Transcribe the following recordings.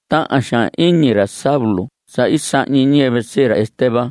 Tahan xaan iñi ra Saulo sa i sahñi ñiyɨvɨ sii ra Esteban.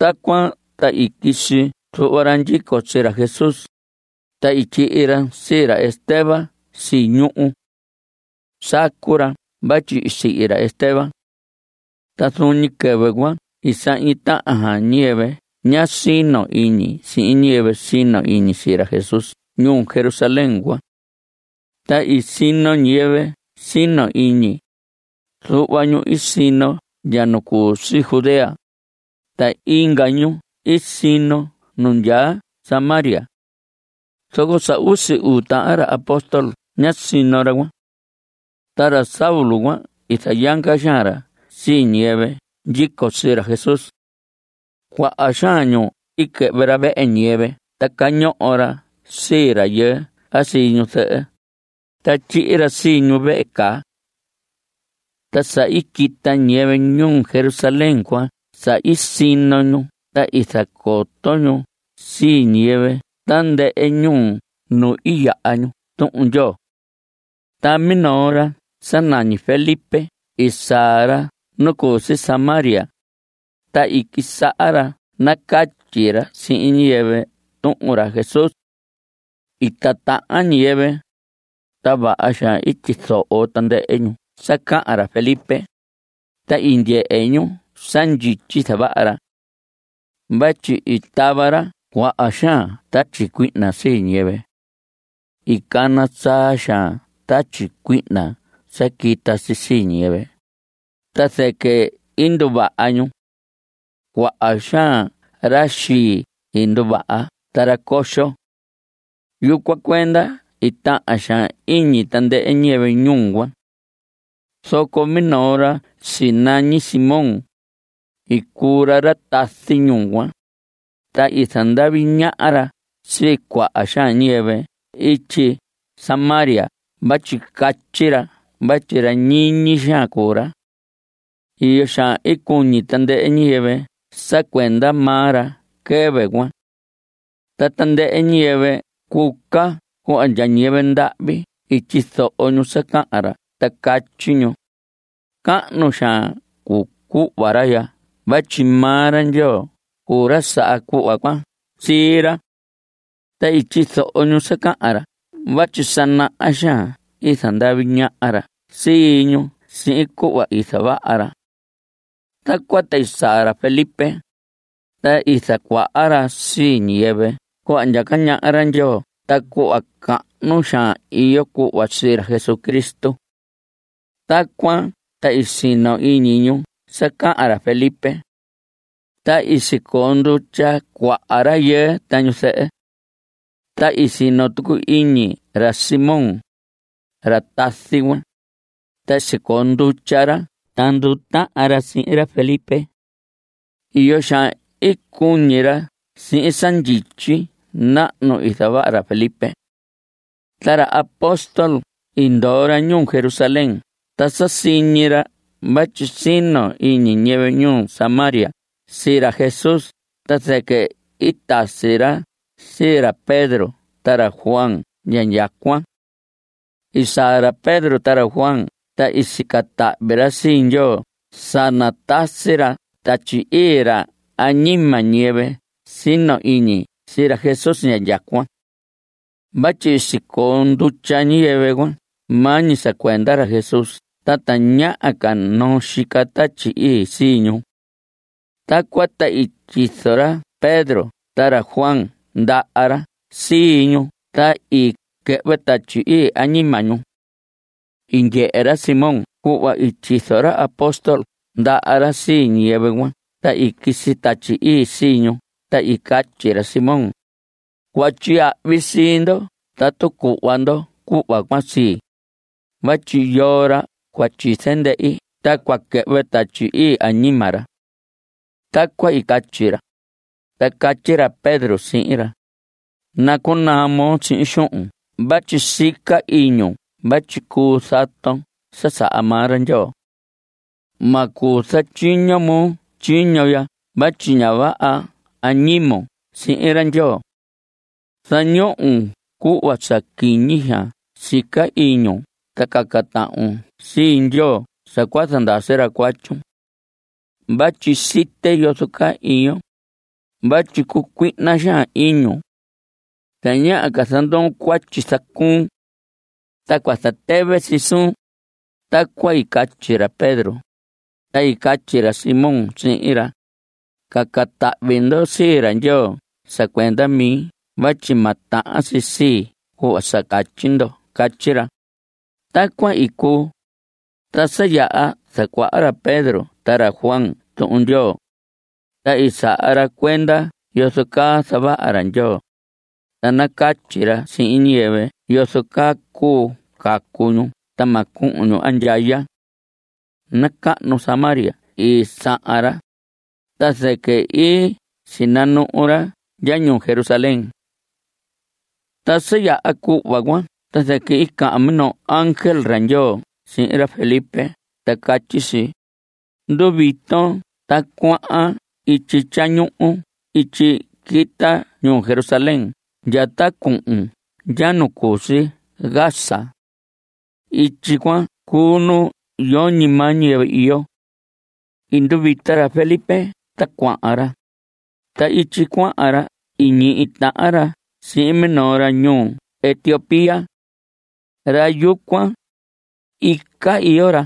Tacuan ta i quisi zuhva ra ndyico sii ra Jesús, ta i tyihi ra sii ra Esteban si ñuhu. Sacu ra vatyi i sihi ra Esteban. Ta zuun ñi quɨvɨ cuan i sahñi tahan ñiyɨvɨ ña sino iñi sihin ñiyɨvɨ sino iñi sii ra Jesús ñuu Jerusalén cuan. Ta i sino ñiyɨvɨ sino iñi. Zuhva ñu i sino ndya nu cu si Judea, ta inga ñu i sino ñu ndya Samaria. Zoco sa usi uu tahan ra apóstol ñá sino ra cuan. Ta ra Saulo cuan i zayanga xaan ra sii ñiyɨvɨ ndyico sii ra Jesús. Cuaha xaan nu i quɨhvɨ ra vehe ñiyɨvɨ ta cañoho ra sii rayɨɨ a sii ñu zɨhɨ, ta tyihi ra sii ñu vehe caa. Ta sa i quita ñiyɨvɨ ñuu Jerusalén cuan sa i sino ñu ta i zacoto ñu sii ñiyɨvɨ tandɨhɨ ñuu nu i yaha ñu Tuhun Ndyoo. Ta minoo ra sa nañi Felipe i saa ra nu cu si Samaria, ta i quisaha ra nacatyi ra sihin ñiyɨvɨ tuhun ra Jesús. I titahan ñiyɨvɨ, ta vaha xaan i tyizoho tandɨhɨ ñu sa cahan ra Felipe, ta i ndyehe ñu sa ndyityi i zavaha ra. Vatyi i tava ra cuaha xaan tatyi cuihna sii ñiyɨvɨ. I cana saa xaan tatyi cuihna sa quita si sii ñiyɨvɨ, ta zɨquɨ i nduvaha ñu. Cuaha xaan ra xii i nduvaha ta ra coxo. Yucuan cuenda i tahan xaan iñi tandɨhɨ ñiyɨvɨ ñuu cuan. Zoco minoo ra sinañi Simón, i cuu ra ra tazi ñuu cuan, ta i zandavi ñaha ra sii cuaha xaan ñiyɨvɨ ityi Samaria vatyi catyi ra vatyi ra ñiñi xaan cuu ra. Iyo xaan i cuñi tandɨhɨ ñiyɨvɨ sa cuenda maa ra quɨvɨ cuan. Ta tandɨhɨ ñiyɨvɨ cuca cuhva ndya ñiyɨvɨ ndahvi i tyizoho ñu sa cahan ra ta catyi ñu: Cahnu xaan cuu cuhva ra ya vatyi maa ra Ndyoo cuu ra saha cuhva cuan sii ra. Ta i tyizoho ñu sa cahan ra vatyi sa naha xaan i zandavi ñaha ra sii ñu sihin cuhva i zavaha ra. Tacuan ta i saa ra Felipe, ta i zacuaha ra sii ñiyɨvɨ cuhva ndyaca ñaha ra Ndyoo ta cuhva cahnu xaan iyo cuhva sii ra Jesucristo. Tacuan ta i sino iñi ñu sa cahan ra Felipe. Ta i sicoo ndutya cuaha rayɨɨ ta ñu zɨhɨ. Ta i sino tucu iñi ra Simón, ra tazi cuan, ta i sicoo ndutya ra ta ndutahan ra sihin ra Felipe. Iyo xaan i cuñi ra sihin sa ndyityi nahnu i zavaha ra Felipe. Ta ra apóstol i ndoo ra ñuu Jerusalén ta sa siñi ra vatyi sino iñi ñiyɨvɨ ñuu Samaria sii ra Jesús ta zɨquɨ i tasi ra sii ra Pedro ta ra Juan ndya indyacuan. I saa ra Pedro ta ra Juan ta i sica tahvi ra sii Ndyoo sa natasi ra Tatyi Ii ra añima ñiyɨvɨ sino iñi sii ra Jesús indyacuan. Vatyi i sicoo ndutya ñiyɨvɨ cuan maa ñi sa cuenda ra Jesús ta tañaha ca noo xica Tatyi Ii sii ñu. Tacuan ta i tyizo ra Pedro ta ra Juan ndaha ra sii ñu ta i quɨhvɨ Tatyi Ii añima ñu. I ndyehe ra Simón cuhva i tyizo ra apóstol ndaha ra sii ñiyɨvɨ cuan ta i quisi Tatyi Ii sii ñu ta i catyi ra Simón: Cua tyiyahvi sii ndo tatu cuhva ndo cuhva cuan sii, vatyi yoo ra cua tyize ndehi ta cua quɨhvɨ Tatyi Ii añima ra. Tacuan i catyi ra. Ta catyi ra Pedro sihin ra: Nacunaa moo sihin xuhun vatyi sica iñun vatyi cuu zaton sa saha maa ra Ndyoo. Ma cuu zatyiño moo tyiño ya vatyi ña vaha añimon sihin ra Ndyoo. Zañon cuhva sa quiñi xaan sica iñun ta caca tahvun sii Ndyoo sa cua zandasi ra cuatyun. Vatyi site yozo caa iyon. Vatyi cucuihna xaan iñun. Tañaha ca zandoon cuatyi zacuun. Ta cua zatɨvɨ si suun. Tacuan i catyi ra Pedro, ta i catyi ra Simón sihin ra: Caca tahvi ndo sii ra Ndyoo sa cuenda mi vatyi ma tahan si sii cuhva sa catyi ndo. Catyi ra. Tacuan i cuu. Ta sa yaha zacuaha ra Pedro ta ra Juan Tuhun Ndyoo, ta i saha ra cuenda yozo caa zavaha ra Ndyoo, ta nacatyi ra sihin ñiyɨvɨ yozo caa cuu cacu ñu ta ma cuhun ñu andyaya. Nacahnu Samaria i sahan ra, ta zɨquɨ i sinanuhu ra ndya ñuu Jerusalén. Ta sa yaha cuhva cuan ta zɨquɨ i cahan minoo ángel ra Ndyoo sihin ra Felipe ta catyi si: Nduviton ta cuahan ityi tyañuhu ityi quita ñuu Jerusalén ya ta cuhun ndya nu cu si Gaza. Ityi cuan cuu nu yoñi maa ñiyɨvɨ iyo. I nduvita ra Felipe ta cuahan ra. Ta ityi cuahan ra i ñihi tahan ra sihin minoo ra ñuu Etiopía. Ra yucuan, ica iyo ra.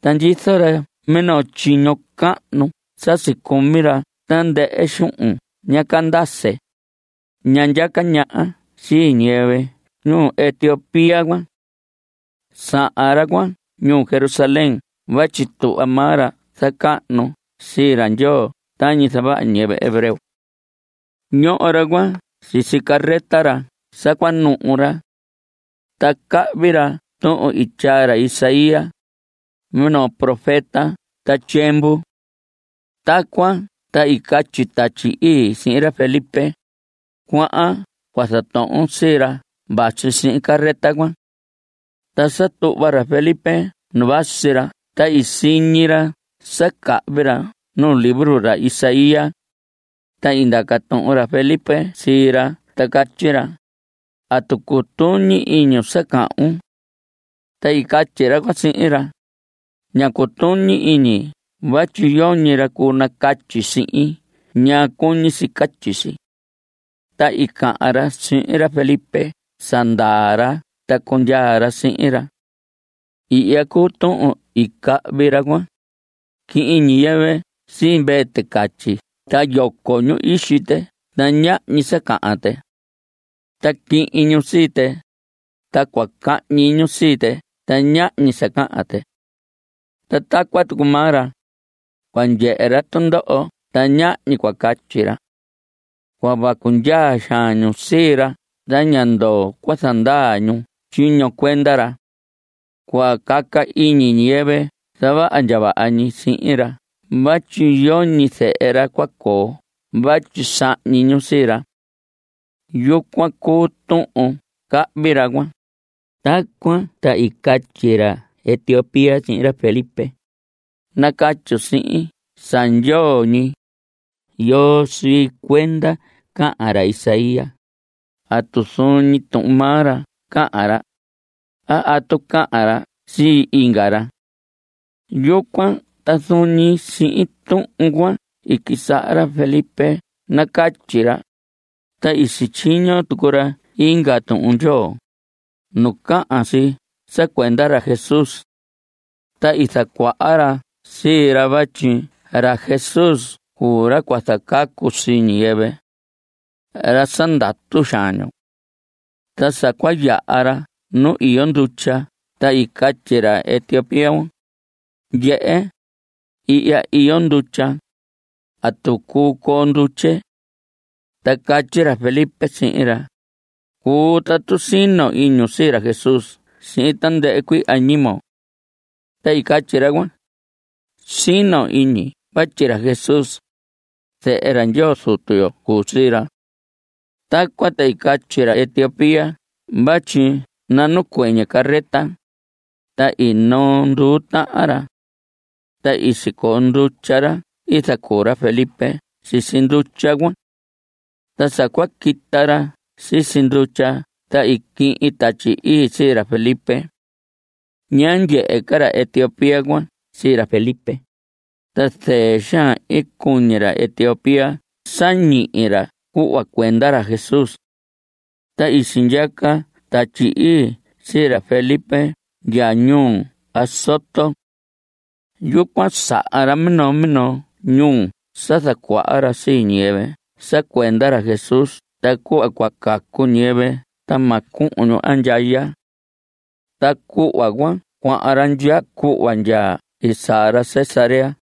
Ta ndyizo ra minoo tyiño cahnu sa sicumi ra tandɨhɨ xuhun ña Candace, ñaha ndyaca ñaha sii ñiyɨvɨ ñuu Etiopía cuan. Sahan ra cuan ñuu Jerusalén vatyi tuhva maa ra zacahnu sii ra Ndyoo tañi zavaha ñiyɨvɨ hebreo. Ñoho ra cuan sisi carreta ra sa cua nuhu ra. Ta cahvi ra tuhun i tyaa ra Isaías, minoo profeta ta tyiemvu. Tacuan ta i catyi Tatyi Ii sihin ra Felipe: Cuahan cua zatohon sii ra vasi sihin carreta cuan. Ta sa tuhva ra Felipe nu vasi ra ta i siñi ra sa cahvi ra nuu libro ra Isaías, ta i ndaca tuhun ra Felipe sii ra ta catyi ra: ¿Atu cutuñi iñun sa cahvun? Ta i catyi ra cuan sihin ra: Ña cutuñi iñi vatyi yoñi ra cuu nacatyi sihin ñaa cuñi si catyi si. Ta i cahan ra sihin ra Felipe sa ndaa ra ta cundyaa ra sihin ra. Ihya cuu tuhun i cahvi ra cuan: Quihin ñiyɨvɨ sii mvee ticatyi ta yoco ñu ixi tɨ ta ñahñi sa cahan tɨ. Ta quihin ñu sii tɨ, ta cua cahñi ñu sii tɨ ta ñahñi sa cahan tɨ. Ta tacuan tucu maa ra, cua ndyehe ra tundoho ta ñahñi cua catyi ra. Cua vacu ndyaa xaan ñu sii ra ta ña ndoo cua zandaa ñu tyiño cuenda ra. Cua caca iñi ñiyɨvɨ zavaha ndya vaha ñi sihin ra vatyi yoñi zehe ra cua coo vatyi sahñi ñu sii ra. Yucuan cuu tuhun cahvi ra cuan. Tacuan ta i catyi ra Etiopía sihin ra Felipe: Nacatyun sihin sa ndyoo ñi. ¿Yoo sii cuenda cahan ra Isaías? ¿Atu zuun ñi tuhun maa ra cahan ra? a ¿atu cahan ra sii inga ra? Yucuan ta zuun ñi sihin tuhun cuan i quisaha ra Felipe nacatyi ra, ta i sityiño tucu ra inga Tuhun Ndyoo, nu cahan si sa cuenda ra Jesús. Ta i zacuaha ra sii ra vatyi ra Jesús cuu ra cua zacacu sii ñiyɨvɨ. Ra sa ndatu xaan ñu. Ta sa cua yaha ra nu iyo ndutya ta i catyi ra Etiopía: Ndyehe, ihya iyo ndutya. ¿Atu cuu coo ndutye? Ta catyi ra Felipe sihin ra: Cuu tatu sino iñun sii ra Jesús sihin tandɨhɨ cuii añimon. Ta i catyi ra cuan: Sino iñi vatyi ra Jesús, zehe ra Ndyoo Zutu yo cuu sii ra. Tacuan ta i catyi ra Etiopía vatyi nanacuɨñɨ carreta, ta i noo nduu tahan ra. Ta i sicoo ndutya ra i zacuu ra Felipe sisi ndutya cuan. Ta sa cua quita ra sisi ndutya, ta i quihin Tatyi Ii sii ra Felipe. Ñá ndyehe ca ra Etiopía cuan sii ra Felipe, ta zɨɨ xaan i cuñi ra Etiopía sa ñihi ra cuhva cuenda ra Jesús. Ta i sindyaca Tatyi Ii sii ra Felipe ndya ñuu Azoto. Yucuan sahan ra minoo minoo ñuu sa zacuaha ra sii ñiyɨvɨ sa cuenda ra Jesús ta cuhva cua cacu ñiyɨvɨ ta ma cuhun ñu andyaya. Ta cuhva cuan cuahan ra ndya cuhva ndya i saa ra Cesarea.